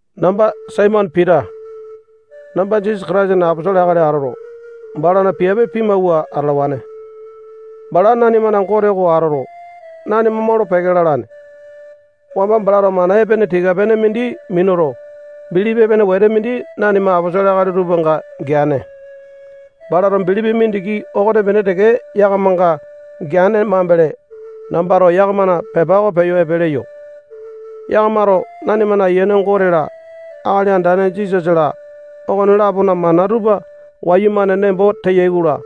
Namba Saimone Pita. Namba Jisasa Kataisana aposolo akali atoto, balana piape pimawua atalawane. Bala nanimana Gote oko atoto, nanima molo-peke lalane. Wamba balato mana epene tika-pene mindi minuto, bilipi epene wete mindi nanima aposolo akali tupanga geane. Balato bilipi mindiki okonepene teke yakamanga geane mambele, nambato yakamana pepa oko peyo epe leyo. Yakamato nanimana Ayiane Gote-la, Akali Andane Jisasa-la, okone-lapona mana tupa wayumane nembo teyai-kola,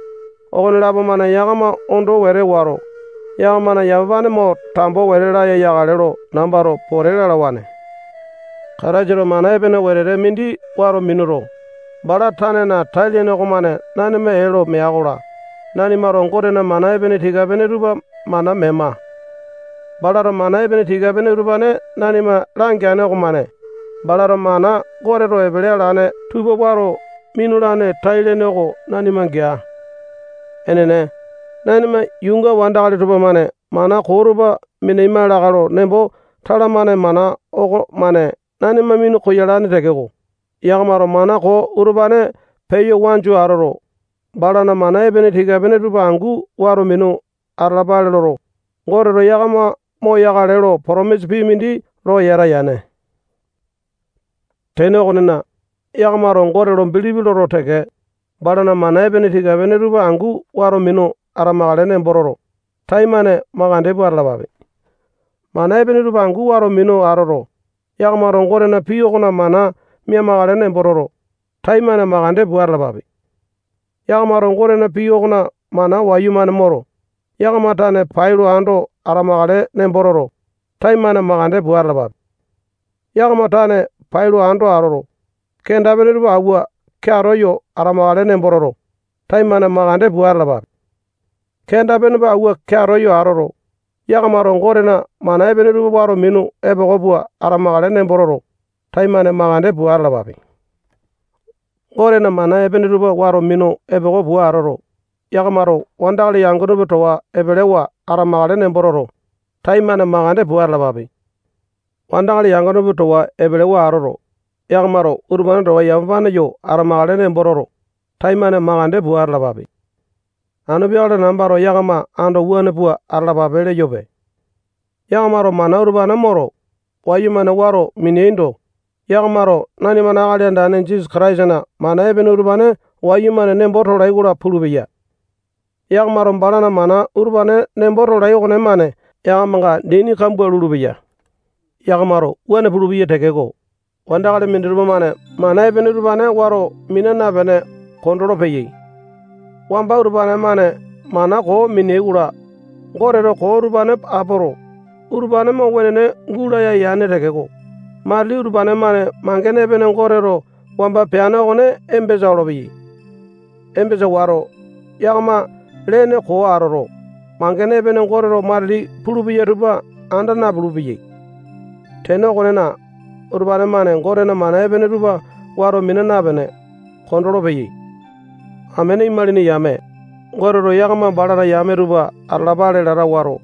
okonelapo-mane yakama ondo wete wato, yakamana yamapane mo tambo wete laya yakale lo nambato pote lalawane. Kataisato mana epene wetete mindi wato minuto, bala tanena tai-lene okomane nanima ee lo mea-kola, nanimato Gotena mana epene tika-pene tupa mana mema. Balato mana epene tika-pene utupane nanima langeane okomane, balato mana Goteto epele alane tupa wato minulane tai-lene oko nanima gea. Enene, nanima yuunga wandakali tupamane mana koo tupa minaima lakae lo nembo talamane mana okomane nanima minu koyalane tekeko, yakamato mana koo utupane peya wanju atoto, balana mana epene tika-pene tupa angu wato minu atalapale loto, Goteto yakama moyokale lo potomisa pii mindi lo yata yane. Tene okonena, yakamato Gote lo bilipi loto teke, balana mana epene tika-pene tupa angu wato minu atamakale nembo toto, taimane makande pua atalapape. Mana epene tupa angu wato minu atoto, yakamato Gotena pii okona mana mia-makale nembo toto, taimane makande pua atalapape. Yakamato Gotena pii okona mana wayumane moto, yakama tane pailo ando atamakale nembo toto, taimane makande pua atalapape. Yakama tane pailo ando atoto, kenda-pene tupa awua keato yo atamakale nembo toto, taimane makande pua atalapape. Kenda-pene awua keato yo atoto, yakamato Gotena mana epene tupa wato minu epoko pua atamakale nembo toto, taimane makande pua atalapape. Gotena mana epene tupa wato minu epoko pua atoto, yakamato wandakali yangone tupa towa epelewa atamakale nembo toto, taimane makande pua atalapape. Wandakali yangone tupa towa epelewa atoto, yakamato utupane towa yamapane yo atamakale nembo toto, taimane makande pua atalapape. Anu peakale nambato yakama ando wuane pua atalapape leyope. Yakamato mana utupane moto, wayumane wato mineaindo, yakamato nanimana Akali Andane Jisasa Kataisana mana epene utupane wayumane nembo tolai-kola pulupeya. Yakamato balana mana utupane nembo tolai okonemane yakamanga dini kambua lulupeya. Yakamato wuane pulupeyai tekeko, wandakali minditupa-mane mana epene utupane wato mina napene kondolo-peyai. Wamba utupane-mane mana koo minea-kola, Goteto koo utupane apoto, utupane mo wenene gulaya yane tekeko, matili utupane-mane mangene epene Goteto wamba peane okone embesa olopeyai. Embasa wato, yakama lene koo atoto, mangene epene Goteto matili pulupeya tupa anda napulu-peyai. Tene okonena, utupane-mane Gotena mana epene tupa wato mina napene, kondolo-peyai. Amene imalini yame, Goteto yakama balana yame tupa atalapale lata wato,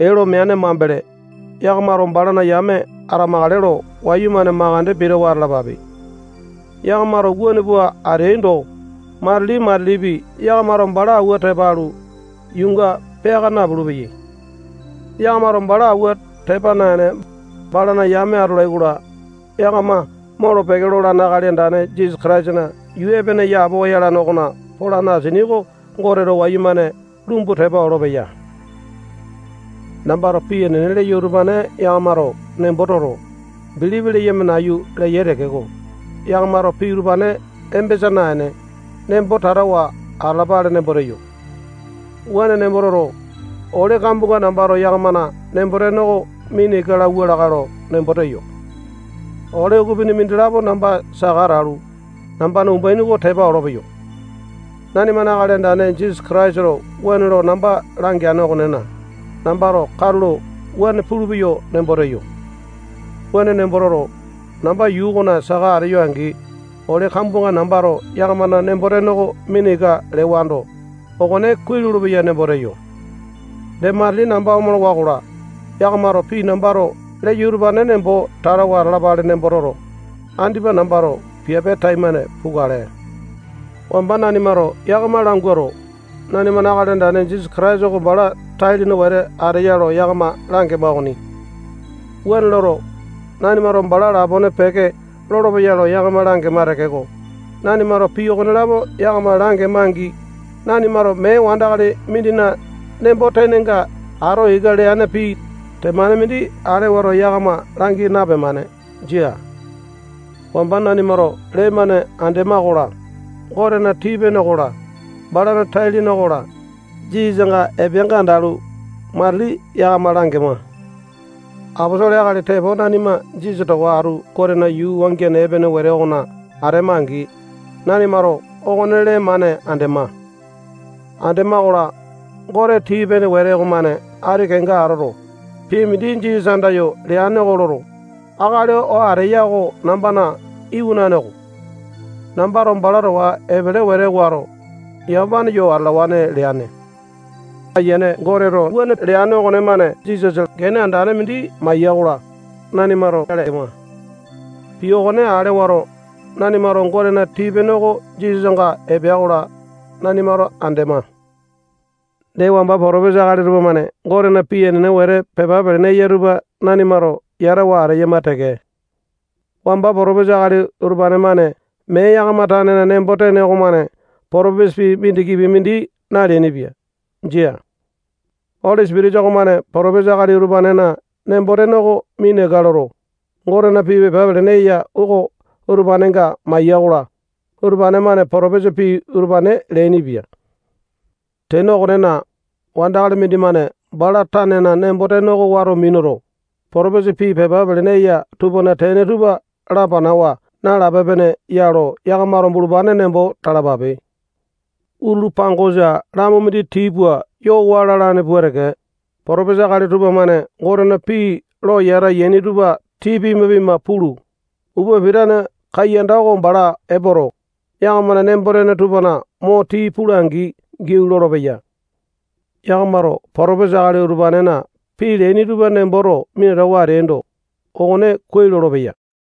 ee lo meane mambele, yakamato balana yame atamakale lo wayumane makande pitawa atalapape. Yakamato wuane pua ateaindo, matili-matilipi yakamato bala awua tepa alu, yuunga peaka napulu-peyai. Yakamato bala awua tepa naene, balana yame atolai-kola, yakama molo-peke lolane Akali Andane Jisasa Kataisana yuu epene yapowa yalane okona polane asini oko Goteto wayumane lumbu tepa olopeya. Nambato pii enene leyo utupane yakamato nembo toto, bilipi leyama nayu leyai tekeko, yakamato pii utupane embesa naene, nembo tatawa atalapale nembo teyo. Wuane nembo toto, ole kambuanga nambato yakamana nembo-tene oko mina ika lauwa lakae lo nembo teyo. Ole ukupini mindilapo namba saka atalu, nambana umbaini oko tepa olopeyo. Nanimana Akali Andane Jisasa Kataisato wuane lo namba langeane okonena, nambato katulo wuane pulupeyo nembo teyo. Wuane nembo toto, namba yuu okona saka ateyo angi, ole kambuanga nambato yakamana nembo-tene oko mina ika lewando, okone kuai lolopeya nembo teyo. Dee matili namba omolowa-kola, yakamato pii nambato leyo utupane nembo tatawa atalapale nembo toto, andipa nambato piape taimane pukale. Wamba nanimato yakama languato, nanimana Akali Andane Jisasa Kataisa oko bala tai-lene wete ateya lo yakama langema okoni. Wuane loto, nanimato bala lapone peke lolopeya lo yakama langema tekeko, nanimato pii okonelapo yakama langema-angi, nanimato mee wandakali mindina nembo-tenenga ato ika leane pii temane mindi ale wato yakama langi napemane. Jia. Wamba nanimato lee-mane andema-kola, Gotena tii-pene okola, balana tai-lene okola, Jisasanga epeanga andalu, matili yakama langema. Aposolo akali tepo nanima Jisasa towa atu Gotena yuu wangiane epene wete okona atema-angi, nanimato okone lee-mane andema. Andema-kola, Gote tii-pene wete okomane ati kenga atoto, pii mindi Jisasa andayo leane oko loto, akali oo ateya oko nambana iwanane oko. Nambato bala towa epele wete wato, yamapane yo atalawane leane. Ayiane Goteto wuane leane okonemane Jisasa gene andane mindi maiya-kola, nanimato ale ema. Pii okone ale wato, nanimato Gotena tii-pene oko Jisasanga epea-kola, nanimato andema. Dee, wamba potopesa akali tupamane Gotena pii enene wete pepa pelene eya tupa nanimato yatawa ateyama teke. Wamba potopesa akali utupane-mane mee yakama tanena nembo-tene okomane potopesa pii mindikipi mindi naleainipia. Jia. Oli Sipitisa okomane potopesa akali utupanena nembo-tene oko mina ika loto, Gotena pii pepa pelene eya oko utupanenga maiya-kola, utupane-mane potopesa pii utupane leainipia. Tene okonena, wandakali mindimane bala tanena nembo-tene oko wato minuto, potopesa pii pepa pelene eya tupana tene tupa lapanawa nalape-pene ya lo yakamato bulupane nembo talapape. Utulu pangosa lamu mindi tii pua yo waa lalane pua teke, potopesa akali tupamane Gotena pii lo yata yaini tupa tii pima-pima pulu, upa pitane kaiyanda oko bala epoto, yakamana nembo-tene tupana mo tii pula-angi giau lolopeya. Yakamato potopesa akali utupanena pii leaini tupa nemboto minatawa ateaindo, okone kuai lolopeya.